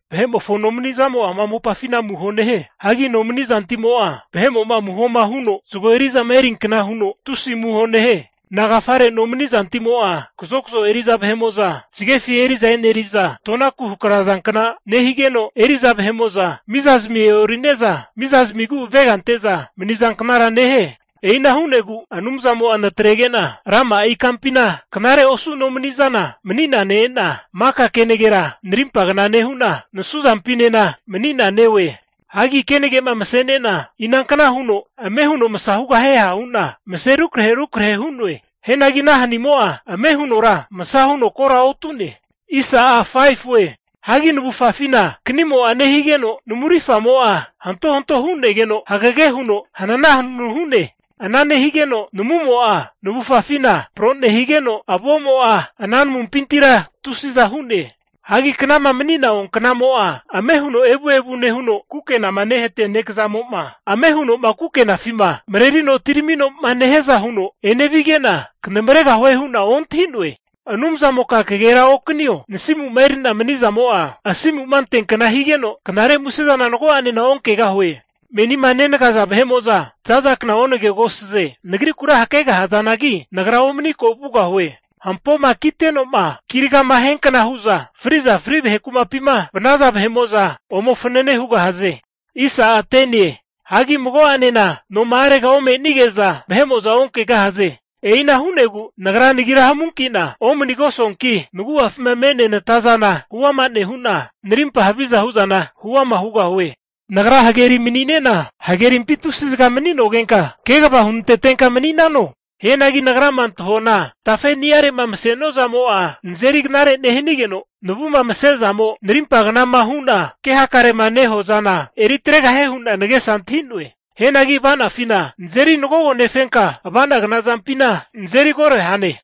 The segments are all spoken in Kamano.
Vahe'mofo nomani'zamo'a ama mopafina amuho nehie. Hagi nomani zantimo'a, vahe'mo'ma amuhoma huno zago eri'zama eriankna huno tusi amuho nehie. Nagafare nomani'zantimo'a kazokzo eri'za vahe'mo'za zagefi eri'za e'neri'za tonaku hakrazankna nehigeno, eri'za vahe'mo'za mizazmi e'ori'ne'za miza zimigu avega ante'za manizanknara nehie. E'ina hu'negu Anumzamo'a natrege'na rama'a ikampina knare osu nomani'zana mani'na ne-e'na maka kenagera narimpagna nehu'na nasu zampinena mani'na neoe. Hagi kenage'ma mase'ne'na, inankna huno ame huno masa hugahie ha hu'na mase rukrahe rukrahe hu'noe. Hianagi ana hanimo'a, ame hunora masa huno kora otu'ne. Hagi navufafina kanimo'a nehigeno namu rifamo'a hantohanto hu'negeno hagege huno hananahanunu hu'ne. Ana nehigeno namumo'a navufafina pro nehigeno avo'mo'a ana namuntamimpintira tusi'za hu'ne. Hagi knama mani'na oanknamo'a ame huno evuevu nehuno, kukenama nehatia nekazamo'ma ame huno'ma kukenafima marerino atiramino'ma nehiaza huno enevige'na, knamaregahue hu'na ontahi'noe. Anumzamoka kagera okanio, nasimu'ma eri'na mani'zamo'a asimu'ma anteankna higeno knare muse zana mago'ane onkegahue. Menima nenagaza vahe'mo'za zazakna onagegosaze. Nagrikura hakegahazanagi, nagra omani ko' vugahue. Hampoma kiteno'ma kiragama hiankna hu'za fri'za fri vahe kumapima vanaza vahe'mo'za ome fanane hugahaze. Hagi mago'anena noma'arega ome'nige'za, vahe'mo'za onkegahaze. E'ina hu'negu nagra nagira hamunki'na omanigosuanki, nagu'afima me'nea nata zana huama nehu'na, narimpa haviza hu'zana huama hugahue. Nagra hageri mani'nena, hagerimpi tusi zaga mani'nogenka kegava hunantetenka mani'nano? Hianagi nagrama antahuana tafe'niare'ma masenua zamo'a nazeri knare nehanigeno, navu'ma mase'zamo narimpa knama hu'na ke hakarema nehuazana eritregahie hu'na nagesa antahi'noe. Hianagi ava'nanifina nazeri nagogonefenka, avanagna zampina nazeri koro hane.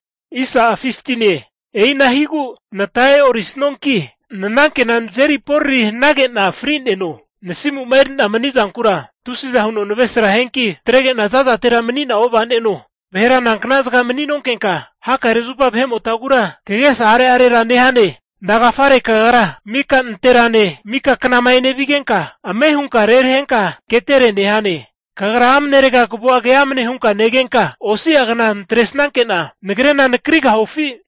E'ina higu nata e'ori snuanki nanankena nazeri porari hanage'na fri'neno. Nasimu'ma eri'na mani'zankura tusiza huno navresra hianki, natrege'na zazatera mani'na ova'neno. Vahera nankna zaga mani'nonkenka, hakare zupa vahe'motagura kagesa are'arerara nehane? Nagafare Kagra mika nanterane, mika knama enevigenka ame hunka rerahenka ketere nehane? Kagra amnerega kavua keamne hunka negenka, osi'a kna natresanke'na nagrena nakrigahufi?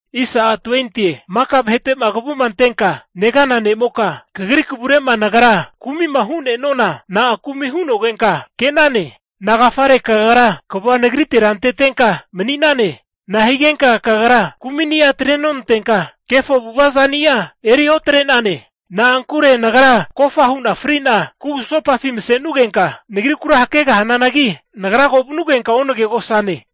Maka vahete'ma kavuma antenka negana ne'moka, kagri kavure'ma nagra kumi'ma hu'ne'nuana, na'a kumi hu'nogenka ke'nane? Nagafare kagra kavua nagritera antetenka mani'nane? Nahigenka Kagra kumi'ni'a atre nonantenka, kefo avu'ava zani'a eri notrane? Na'ankure nagra kofa hu'na fri'na kugusopafina mase'nugenka nagrikura hakegahananagi, nagra ko vanugenka onagegosane.